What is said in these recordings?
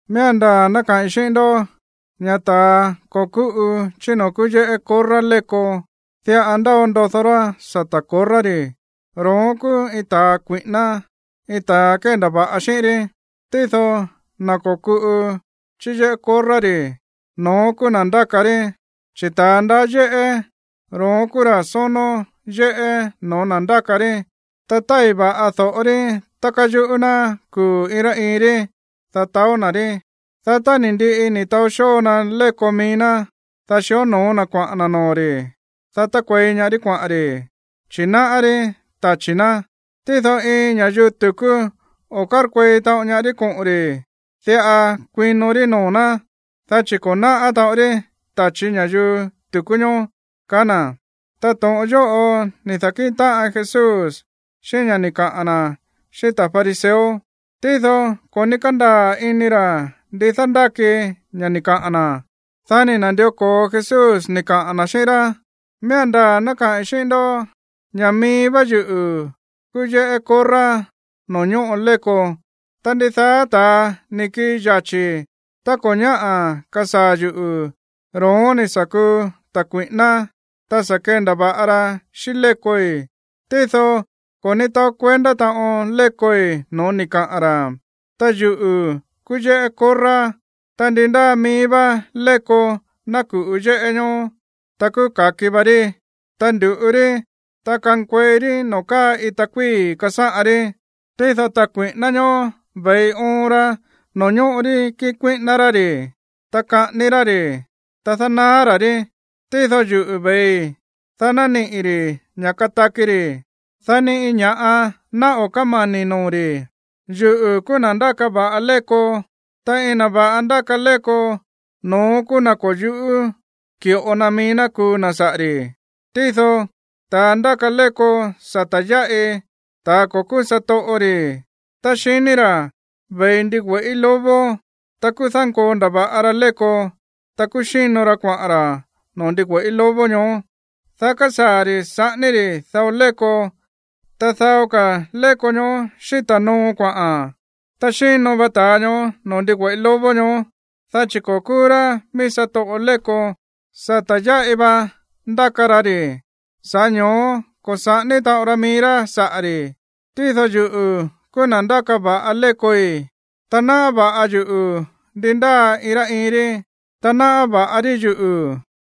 ’Miía̱n ndaa̱ ná kaꞌi̱n xíꞌín ndó ña̱ ta̱a ko̱ kúꞌu chí noo̱ kúú yéꞌé korrá léko, diꞌa ndáo ndodó rá sata̱ korrá ri̱, ro̱ón kúú iin ta̱ kui̱ꞌíná, iin ta̱ kéndava̱ꞌa xíꞌín rí. Tído na̱ ko̱kuꞌu chí yéꞌé korrá ri̱, no̱ón kúú na̱ ndáka rí. Chi̱ ta̱ ndaá yéꞌé, ro̱ón kúú ra̱ sónó yéꞌé no̱ó na̱ ndáka rí. Ta tái̱ va̱ꞌa do̱ꞌo rí tá káyuꞌú ná kuu̱ iin rá iin rí, dá taó na̱ rí. Dá tá ni̱ ndiꞌi ni̱ taó xóo na léko mií ná, dá xíonoo na kuaꞌa̱n na̱ noo̱ ri̱, dá tákuei ñaá rí kuaꞌa̱n ri̱, chi̱ náꞌá rí tachi̱ ná. Tído iin ña̱yuu tu̱kú o̱ kárkuei taꞌon ñaá rí koꞌo̱n ri̱, diꞌa kuino rí noo̱ ná, dá chi̱ ko̱ náꞌá taꞌon rí tachi̱ ña̱yuu tu̱kú ñoó ―kaá na̱. Ta to̱ꞌon yóꞌo ni̱ da̱kíꞌin táꞌan Jesús xíꞌín ña̱ ni̱ kaꞌa̱n na̱ xíꞌín ta̱ fariseo, tído ko̱ ní kándaa̱ ini ra̱ ndi dándáki ña̱ ni̱ kaꞌa̱n na̱. Dá ni̱ na̱ndió ko̱o Jesús ni̱ kaꞌa̱n na̱ xíꞌín rá: ―Miía̱n ndaa̱ ná kaꞌi̱n xíꞌín ndó ña̱ mií vá yuꞌu̱ kúú yéꞌé korrá noo̱ ñóꞌo léko. Ta ndidaá ta̱a ni̱ kii yachi̱ tá ko̱ ñáꞌa̱ kasaa̱ yuꞌu̱, ro̱ón ni̱ sa̱ kuu ta̱ kui̱ꞌíná, ta sa̱ kendava̱ꞌa ra xíꞌín lékoi̱. Tído ko̱ ní taó kuendá taꞌon lékoi̱ no̱ó ni̱ kaꞌa̱n ra̱. Ta yuꞌu̱ kúú yéꞌé korrá, ta ndi ndáa mií vá léko ná ku̱ꞌu yéꞌé ñoó, ta kúú ka̱ki va rí. Ta ndu̱ꞌu rí, ta kankuei rí noo̱ káa ita kuíi̱ kasáꞌan rí. Tído ta̱ kui̱ꞌíná ñoó ve̱i oon ra noo̱ ñóꞌo rí kiꞌin kuíꞌíná rá ri̱, ta kaꞌání rá ri̱, ta dánaá ra̱ rí. Tído yuꞌu̱ ve̱i, dá ná niꞌi̱ ri̱ ña̱ kataki ri̱, dá ni iin ña̱ꞌa ná o̱ kámani̱ noo̱ ri̱. ’Yuꞌu̱ kúú na̱ ndáka va̱ꞌa léko, ta iin na̱ va̱ꞌa ndáka léko, no̱ón kúú na̱ ko̱ yu̱ꞌú ki̱ꞌo na mií ná kuu na̱ saꞌa̱ ri̱. Tído ta̱ ndáka léko sata̱ yáꞌi, ta̱ ko̱ kúú satoꞌo ri̱, tá xiní ra̱ ve̱i ndigüe̱ꞌí lobo, ta kúú dánkoo ndava̱ꞌa ra léko, ta kúú xíno ra kuaꞌa̱n ra̱ noo̱ ndigüe̱ꞌí lobo ñoó. Dá kásaa̱ ri̱ saꞌání ri̱ dao léko, ta dao ka̱ léko ñoó xíta̱ no̱ó kuaꞌa̱n. Ta xíno va ta̱a ñoó noo̱ ndigüe̱ꞌí lobo ñoó, dá chi̱ ko̱ kúú rá mií satoꞌo léko, sata̱ yáꞌi va ndáka ra ri̱, sa̱ꞌá ño̱ó ko̱ saꞌání taꞌon ra mií rá saꞌa̱ ri̱. ’Tído yuꞌu̱ kúú na̱ ndáka va̱ꞌa lékoi̱, ta náꞌá va̱ꞌa yuꞌu̱ ndi ndáa iin rá iin rí, ta náꞌá va̱ꞌa rí yuꞌu̱,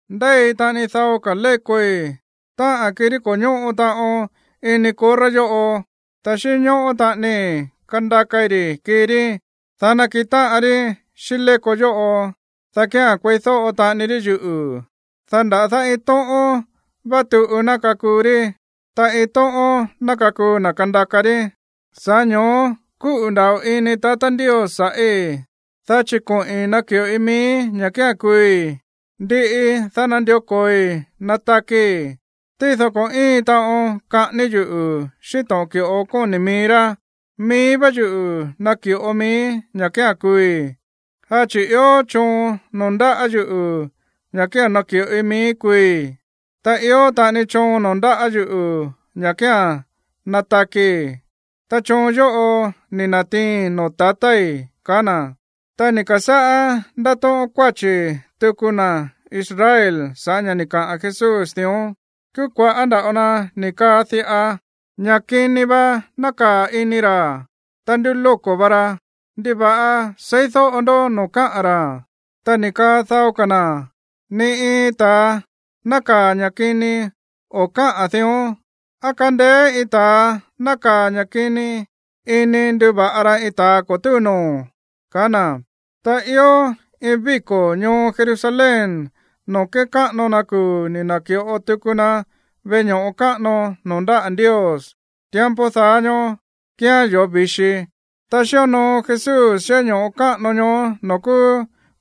Ndéi taꞌani dao ka̱ lékoi̱, táꞌa̱n kirí ko̱ ñóꞌo taꞌon ini korrá yóꞌo. Ta xínñóꞌó taꞌanii kandakai ri̱ kii rí, dá nakiꞌin táꞌan rí xíꞌín léko yóꞌo, dá kía̱n kueídóꞌo taꞌani rí yuꞌu̱. Dá nda̱dá iin tóꞌón vá tuꞌu ná kakuu rí, ta iin tóꞌón ná kakuu na̱ kandaka rí. ’Sa̱ꞌá ño̱ó kúꞌu̱ nda̱ꞌo ini tatá Ndios sa̱ꞌí, dá chi̱ koꞌi̱n naki̱ꞌoi miíí ña̱ kía̱n kuui̱, ndiꞌi, dá nandió ko̱oi natakii̱. Tído ko̱ íin taꞌon kaꞌání yuꞌu̱ xíꞌín to̱ꞌon ki̱ꞌo kóni̱ mií rá, mií vá yuꞌu̱ naki̱ꞌo miíí ña̱ kía̱n kuui̱. Dá chi̱ ió choon noo̱ ndáꞌa̱ yuꞌu̱ ña̱ kía̱n naki̱ꞌoi miíí kuui̱, ta ió taꞌani choon noo̱ ndáꞌa̱ yuꞌu̱ ña̱ kía̱n natakii̱, ta choon yóꞌo ni̱ na̱tiiin noo̱ tatái̱ ―kaá na̱. Ta ni̱ ka̱sáꞌá ndátóꞌón kuáchi̱ tuku na̱ Israel sa̱ꞌá ña̱ ni̱ kaꞌa̱n Jesús dión. Kúú kua̱ꞌá nda̱ꞌo na ni̱ kaa diꞌa: ―Ña̱ kini va nákaa̱ ini ra̱, ta ndúlóko̱ va ra. ¿Ndiva̱ꞌa seídóꞌo ndó noo̱ káꞌa̱n ra̱? Ta ni̱ kaa dao ka̱ na̱: ―Ni iin ta̱ nákaa̱ ña̱ kini o̱ káꞌa̱n dión. ¿Á kándéé iin ta̱a nákaa̱ ña̱ kini ini nduva̱ꞌa ra iin ta̱ ko̱ túu noo̱? ―kaá na̱. Ta ió iin víko̱ ñoo Jerusalén noo̱ kékáꞌano na kuu̱ ni̱ na̱ki̱ꞌo tuku na veꞌe ño̱ꞌo káꞌano noo̱ ndáꞌa̱ Ndios. Tiempo daá ñóó kíán yoo̱ vi̱xi. Ta xíonoo Jesús yéꞌé ño̱ꞌo káꞌano ñoó noo̱ kúú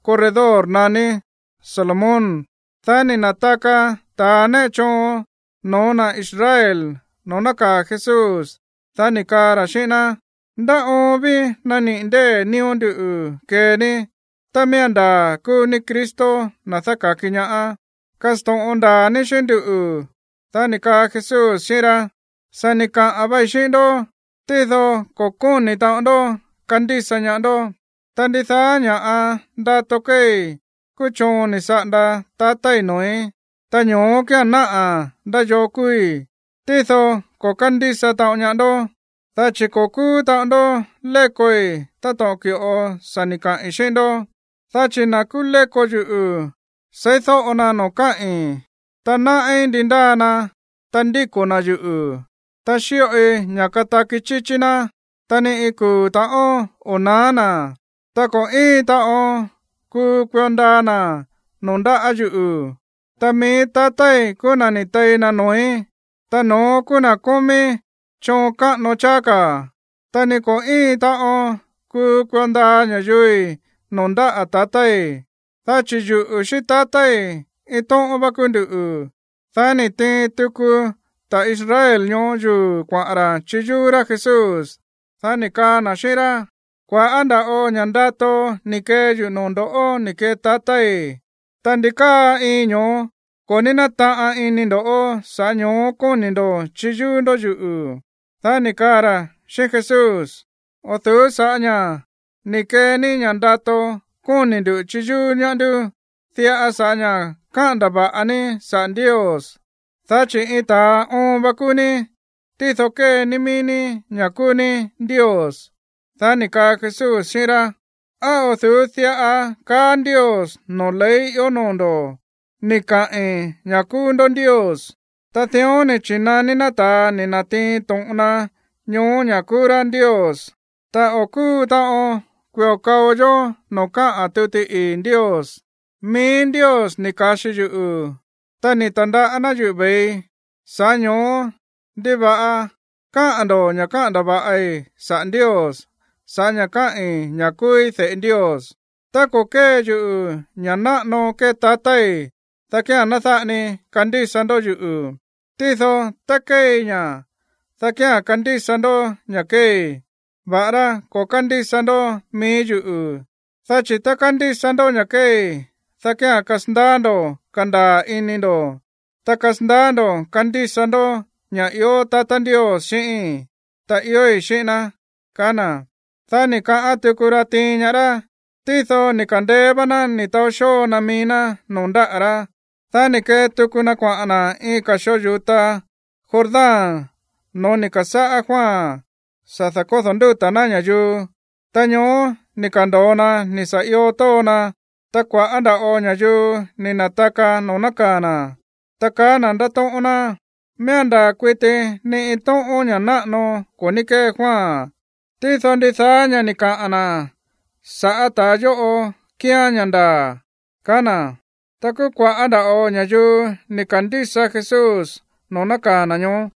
corredor naní Salomón. Dá ni̱ na̱taka ta̱ néꞌe choon no̱ó na̱ Israel noo̱ nákaa̱ Jesús, dá ni̱ kaa ra̱ xíꞌín ná: ―¿Ndá oon ví nániꞌi̱ ndée̱ nío̱ ndú kee ní? Tá miía̱n ndaa̱ kúú ní Cristo, na̱ dáka̱ki ñaá, kasto̱ꞌon ndaa̱ ní xíꞌín nduꞌu̱. Dá ni̱ kaa Jesús xíꞌín rá: ―Sa̱ ni̱ kaꞌa̱n vai xíꞌín ndó, tído ko̱ kóni̱ taꞌon ndó kandísa ñaá ndó. Ta ndidaá ña̱ ndato kéei kúú choon ni̱ saꞌanda tatái̱ noo̱í, ta ño̱ó kía̱n náꞌa̱ ndá yoo kúúí. Tído ko̱ kándísa taꞌon ñaá ndó, dá chi̱ ko̱ kúú taꞌon ndó lékoi̱ táto̱ꞌon ki̱ꞌo sa̱ ni̱ kaꞌi̱n xíꞌín ndó. Dá chi̱ na̱ kúú léko yuꞌu̱ seídóꞌo na noo̱ káꞌi̱n, ta náꞌí ndi ndáa na, ta ndíko̱ na̱ yuꞌu̱, ta xíꞌoi ña̱ kataki chíchí ná, ta ni iin kuu̱ ta̱ꞌón o̱ naá na̱, ta ko̱ íin taꞌon kuu kuio ndaa na̱ noo̱ ndáꞌa̱ yuꞌu̱. Ta mií tatái̱ kúú na̱ ni̱ tei na noo̱í, ta no̱ón kúú na̱ kómí choon káꞌano cháá ka̱, ta ni ko̱ íin taꞌon kuu kuio ndaa ña̱yuui̱ noo̱ ndáꞌa̱ tatái̱. Dá chi̱ yuꞌu̱ xíꞌín tatái̱, iin tóꞌón vá kúú nduꞌu̱. Dá ni̱ tiin tuku ta̱ Israel ñoó yuu̱ kuaꞌa̱n ra̱ chiyúú rá Jesús. Dá ni̱ kaa na̱ xíꞌín rá: ―Kua̱ꞌá nda̱ꞌo ña̱ ndato ni̱ kee yuꞌu̱ noo̱ ndo̱ꞌó ni̱ kee tatái̱. Ta, ¿ndi káa iin ño̱ó ko̱ ní nátaꞌan ini ndo̱, sa̱ꞌá ño̱ó kóni̱ ndo̱ chiyúú ndó yuꞌu̱? Dá ni̱ kaa ra̱ xíꞌín Jesús: ―O̱ du̱ú sa̱ꞌá ña̱ ni̱ kee ní ña̱ ndato kóni̱ ndu̱ chiyúú ñaá ndú, diꞌa sa̱ꞌá ña̱ káꞌa̱n ndava̱ꞌa ní saꞌa̱ Ndios, dá chi̱ iin ta̱a oon va kúú ní, tído kée ní mií ní ña̱ kúú ní Ndios. Dá ni̱ kaa Jesús xíꞌín rá: ―¿Á o̱ du̱ú diꞌa kaá Ndios noo̱ ley ió noo̱ ndo̱: “Ni̱ kaꞌi̱n ña̱ kúú ndó ndios”? Ta dión ni̱ chi̱naní ná ta̱a ni̱ na̱tiin to̱ꞌon na ñoó ña̱ kúú rá ndios, ta o̱ kúu taꞌon kui̱o kao yó noo̱ káꞌa̱n tuti ii̱ Ndios. Mií Ndios ni̱ ka̱xi yuꞌu̱, ta ni̱ ta̱ndaꞌá ná yuꞌu̱ ve̱ii, sa̱ꞌá ño̱ó, ¿ndiva̱ꞌa kaá ndo̱ ña̱ káꞌa̱n ndava̱ꞌi saꞌa̱ Ndios sa̱ꞌá ña̱ kaái̱ ña̱ kúúí de̱ꞌe Ndios? Tá ko̱ kée yuꞌu̱ ña̱ náꞌano kée tatái̱, dá kía̱n ná dáꞌa ni kandísa ndó yuꞌu̱. Tído tá kéei ña̱, dá kía̱n kandísa ndó ña̱ kéei, va̱ꞌará ko̱ kándísa ndó mií yuꞌu̱. Dá chi̱ tá kandísa ndó ña̱ kéei, dá kía̱n kasandaá ndo̱ kandaa̱ ini ndo̱, ta kasandaá ndo̱ kandísa ndó ña̱ ió tatá Ndios xíꞌíi̱n, ta iói̱ xíꞌín ná ―kaá na̱. Dá ni̱ kaꞌán tuku ra tiin ñaá rá, tído ni̱ ka̱ndeé vá ná ni̱ taó xóo na mií ná noo̱ ndáꞌa̱ rá. Dá ni̱ kee tuku na kuaꞌa̱n na̱ iin ka̱ xoo yu̱ta Jordán no̱ó ni̱ ka̱sáꞌá Juan sa̱ da̱kódo̱ ndúta̱ ná ña̱yuu. Ta ñoó ni̱ ka̱ndo̱o na ni̱ sa̱ io tóo na. Ta kua̱ꞌá nda̱ꞌo ña̱yuu ni̱ na̱taka noo̱ nákaa̱ na̱, ta kaá na̱ ndátóꞌón ná: ―Miía̱n ndaa̱ kuiti ni iin tóꞌón ña̱ náꞌano ko̱ ní kée Juan, tído ndidaá ña̱ ni̱ kaꞌa̱n na̱ sa̱ꞌá ta̱a yóꞌo kíán ña̱ ndaa̱ ―kaá na̱. Ta kúú kua̱ꞌá nda̱ꞌo ña̱yuu ni̱ ka̱ndísa Jesús noo̱ nákaa̱ na̱ ñoó.